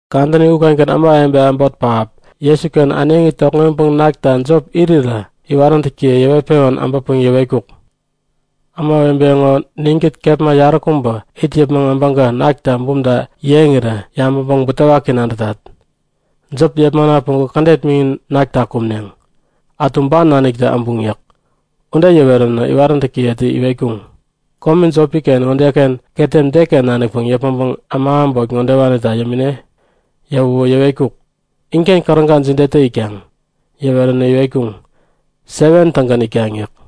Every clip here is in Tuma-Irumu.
Kadäni ukengän ämawebe äbot pähap Jesuken äneŋi tokŋeŋpäŋ nakta jop irirä iwaräntäkiye yäŋpewän äbäpäŋ yäwetkuk; Ämawebe ŋo ninkät kepma yaräkubä it yäpmäŋ äbäŋkä nakta bumta yeŋirä yabäŋpäŋ butewaki nadätat. Jop yepmana päŋku kädet miŋin nakta kumneŋ. Ätu ban naniktä äbuŋ yäk. Ude yäweränä iwaräntäkiyetä iwetkuŋ; Kome jopi-ken ŋodeken ketem deken nanikpäŋ yäpmäŋpäŋ äma äbot ŋodewanita yämine? Yäwäwä yäwetkuk; Inken käräga jidetä itkaŋ? Yäweränä iwetkuŋ; 7tägän itkaŋ yäk.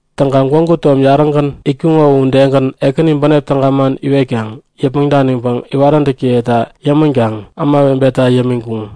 Täŋkaŋ gwägu tom yarägän itkuŋo u udegän Ekäni bänep täga man iwetkaŋ yäpmäŋ daniŋpäŋ iwaräntäkiyeta yämänkaŋ ämawebeta yämiŋkuŋ.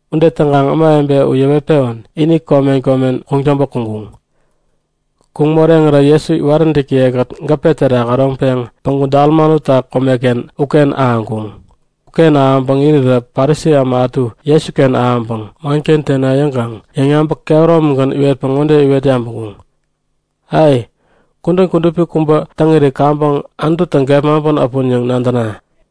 Ude täŋkaŋ ämawebe u yäwet-pewän ini komen komen kuŋtäŋpä kuŋkuŋ. Kuŋ moreŋirä Jesu iwaräntäkiye-kät gäpe terak äroŋpeŋ päŋku Dalmanuta komeken uken ahäŋkuŋ. Uken ahäŋpäŋ irirä Parisi äma ätu Jesuken äbäŋpäŋ manken tena yäŋkaŋ yäŋyabäk kehäromigän iwetpäŋ ŋode iwet yabäŋkuŋ; Ai! Kudän kudupi kubä täŋiri kaŋpäŋ Anututä gepmaŋpän äpun yäŋ nadäna!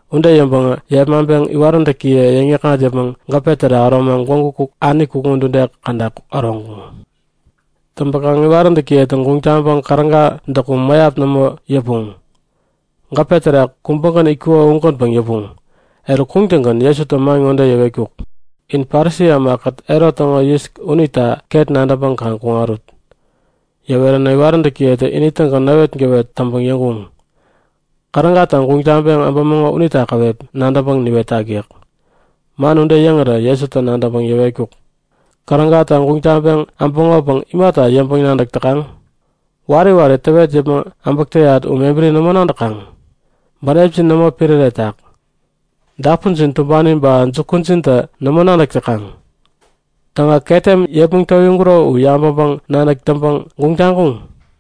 Ude yäŋpäŋä yepmaŋpeŋ iwaräntäkiye yäŋ-yäkŋat yäpmäŋ gäpe terak äromaŋ gwägu ani kukŋi udude käda äroŋkuŋ. Täŋpäkaŋ iwaräntäkiyetä guŋ taŋpäŋ käräga däkum mäyap nämo yäpuŋ. Gäpe terak kubägän itkuko ugänpäŋ yäpuŋ. Eruk kuŋtäŋgän Jesutä man ŋode yäwetkuk; In Parisi ämakät Herot täŋo yis unita ket nadäŋpäŋ kaŋ kuŋarut! Yäweränä iwaräntäkiyetä ini-tägän näwetgäwet täŋpäŋ yäŋkuŋ; Kärägata guŋ taŋpeŋ äbämäŋo unita käwep nadäŋpäŋ niwetak yäk. Man ude yäŋirä Jesutä nadäŋpäŋ yäwetkuk; Kärägata guŋ taŋpeŋ äbäŋopäŋ imata yäŋpäŋ-nadäk täkaŋ? Wari wari täwet yäpmäŋ äbäk täyat u mebäri nämo nadäkaŋ? Bänepjin nämo piräreyätak? Dapunjin tumbani ba jukujintä nämo nadäk täkaŋ? Täŋä ketem yepmäŋ towiŋkuro u yabäŋpäŋ-nadäk täŋpäŋ guŋ taŋkuŋ?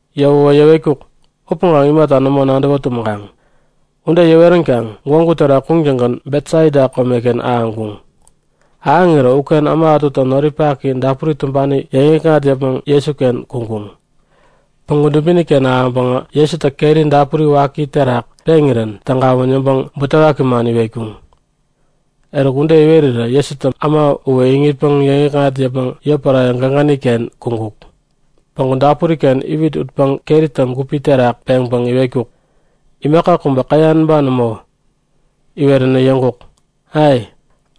Yäwäwä yäwetkuk; Upäŋ imata nämo nadäwä tumäŋkaŋ? Ude yäweränkaŋ gwägu terak kuŋtäŋgän Betsaida komeken ahäŋkuŋ. Ahäŋirä uken äma ätutä noripak dapuri tumbani yäŋikŋat yäpmäŋ Jesuken kuŋkuŋ. Päŋku dubini-ken ahäŋpäŋä Jesutä keri dapuri waki terak peŋirän tägawän yäŋpäŋ butewaki man iwetkuŋ. Eruk ude iwerirä Jesutä äma uwä iŋitpäŋ yäŋikŋat yäpmäŋ yotpärare gägäni-ken kuŋkuk. Päŋku dapuri-ken iwit utpäŋ keritä gupi terak peŋpäŋ iwetkuk; Imaka kubä käyan ba nämo? Iweränä yäŋkuk; Ai,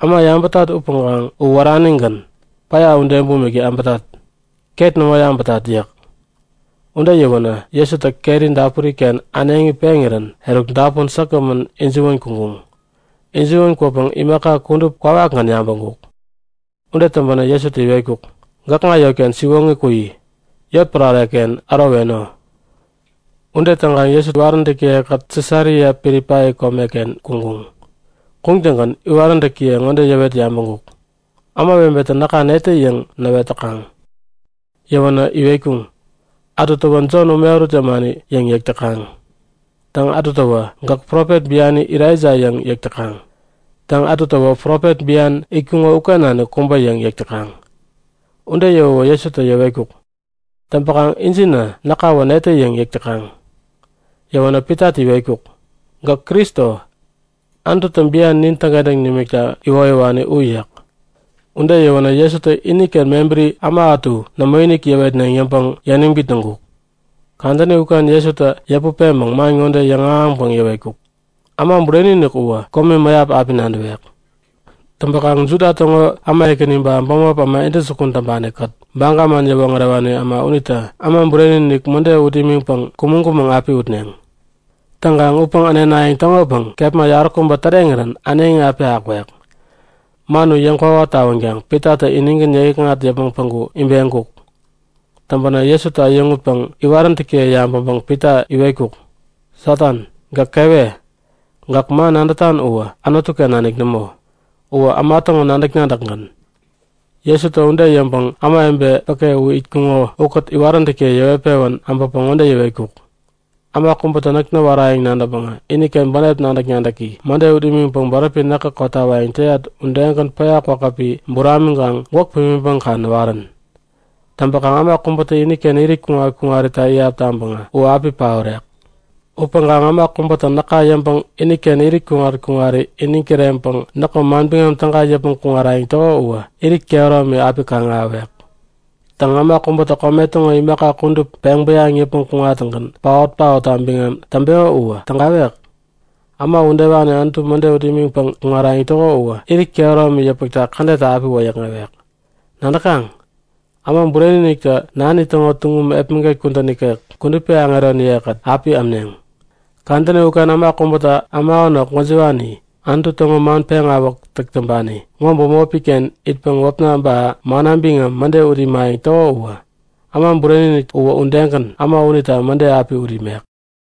äma yabätat upäŋkaŋ u wäranigän, päya ude bumik yabätat. Ket nämo yabätat yäk. Ude yäwänä Jesutä keri dapuri-ken äneŋi peŋirän eruk dapun säkgämän ijiwän kuŋkuŋ. Ijiwän kwäpäŋ imaka kudup kwawakgän yabäŋkuk. Ude täŋpänä Jesutä iwetkuk; Gäkŋa yotken siwoŋi kuyi. Yotpärare-ken äroweno. Ude täŋkaŋ Jesu iwaräntäkiye-kät Sisaria Pilipai komeken kuŋkuŋ. Kuŋtäŋgän iwaräntäkiye ŋode yäwet yabäŋkuk; Ämawebetä näka netä yäŋ näwet täkaŋ? Yäwänä iwetkuŋ; Ätutäwä Jon ume ärut yämani yäŋ yäk täkaŋ. Ba ätutäwä gäk profet biani Elaija yäŋ yäk täkaŋ. Täŋ, ätutäwä profet bian itkuŋo uken nanik kubä yäŋ yäk täkaŋ. Ude yäwäwä Jesutä yäwetkuk; Täŋpäkaŋ injinä näkawä netä yäŋ yäk täkaŋ? Yäwänä Pitatä iwetkuk; Gäk Kristo, Anututä bian nin täŋkentäŋ nimikta iwoyäwani u yäk. Ude yäwänä Jesutä iniken mebäri äma ätu nämoinik yäwetneŋ yäŋpäŋ yäniŋ bitnäŋkuk. Kadäni uken Jesutä yäput peŋpäŋ man ŋode yäŋahäŋpäŋ yäwetkuk; Äma Bureni-inik uwä komi mäyap api nadäwek. Täŋpäkaŋ Juda täŋo äma ekäni, ba bämop äma intäjukun täŋpani-kät Baga man yäwoŋärewani äma unitä Äma Bureni-inik mäde ut imiŋpäŋ kumäŋ-kumäŋ api utneŋ. Täŋkaŋ utpäŋ änenayäŋ täŋopäŋ kepma yaräkubä täreŋirän äneŋi api akwek. Man u yäŋkwawa tawänkaŋ Pitatä inigän yäŋikŋat yäpmäŋ päŋku ibeŋkuk. Täŋpänä Jesutä äyäŋutpäŋ iwaräntäkiye yabäŋpäŋ Pita iwetkuk; Satan, gäk kewe! Gäk man nadätan uwä Anutu-ken nanik nämo. Uwä äma täŋo nadäk-nadäkgän. Jesutä ude yäŋpäŋ ämawebe päke u itkuŋo ukät iwaräntäkiye yäŋpewän äbäpäŋ ŋode yäwetkuk; Äma kubätä näk näwarayäŋ nadäŋpäŋä iniken bänep nadäk-nadäki mäde ut imiŋpäŋ bäräpi näkä kotawayäŋ täyat udegän päya kwakäpi buramiŋkaŋ gwäk pimiŋpäŋ kaŋ näwarän. Täŋpäkaŋ äma kubätä iniken irit kuŋat-kuŋarita iyap taŋpäŋä u api paorek. Upäŋkaŋ äma kubätä näka yäŋpäŋ iniken irit kuŋat-kuŋari iniŋ kireŋpäŋ näkŋo Manbiŋam Täga yäpmäŋ kuŋarayäŋ täko uwä irit kehäromi api kaŋ-ahäwek. Täŋ, äma kubätä kome täŋo imaka kudup peŋ bäyaŋpäŋ yäpmäŋ kuŋattäŋgän paot-paotta biŋam täŋpeko uwä tägawek? Äma udewani Anutu mäde ut imiŋpäŋ kuŋarayäŋ täko uwä irit kehäromi yäpmäkta kädetta api wäyäkŋewek. Nadäkaŋ? Äma Bureni-iniktä nani täŋo tuŋum epmäget kudän ikek kudupi aŋeroniye-kät api äpneŋ. Kadäni uken äma kubätä äma änok gwäjiwani, Anutu täŋo man peŋawäk täk täŋpani ŋo bämopi-ken itpäŋ wäpna ba manna biŋam mäde ut imayäŋ täko uwä, Äma Bureni-inik uwä udegän äma unita mäde api ut imek.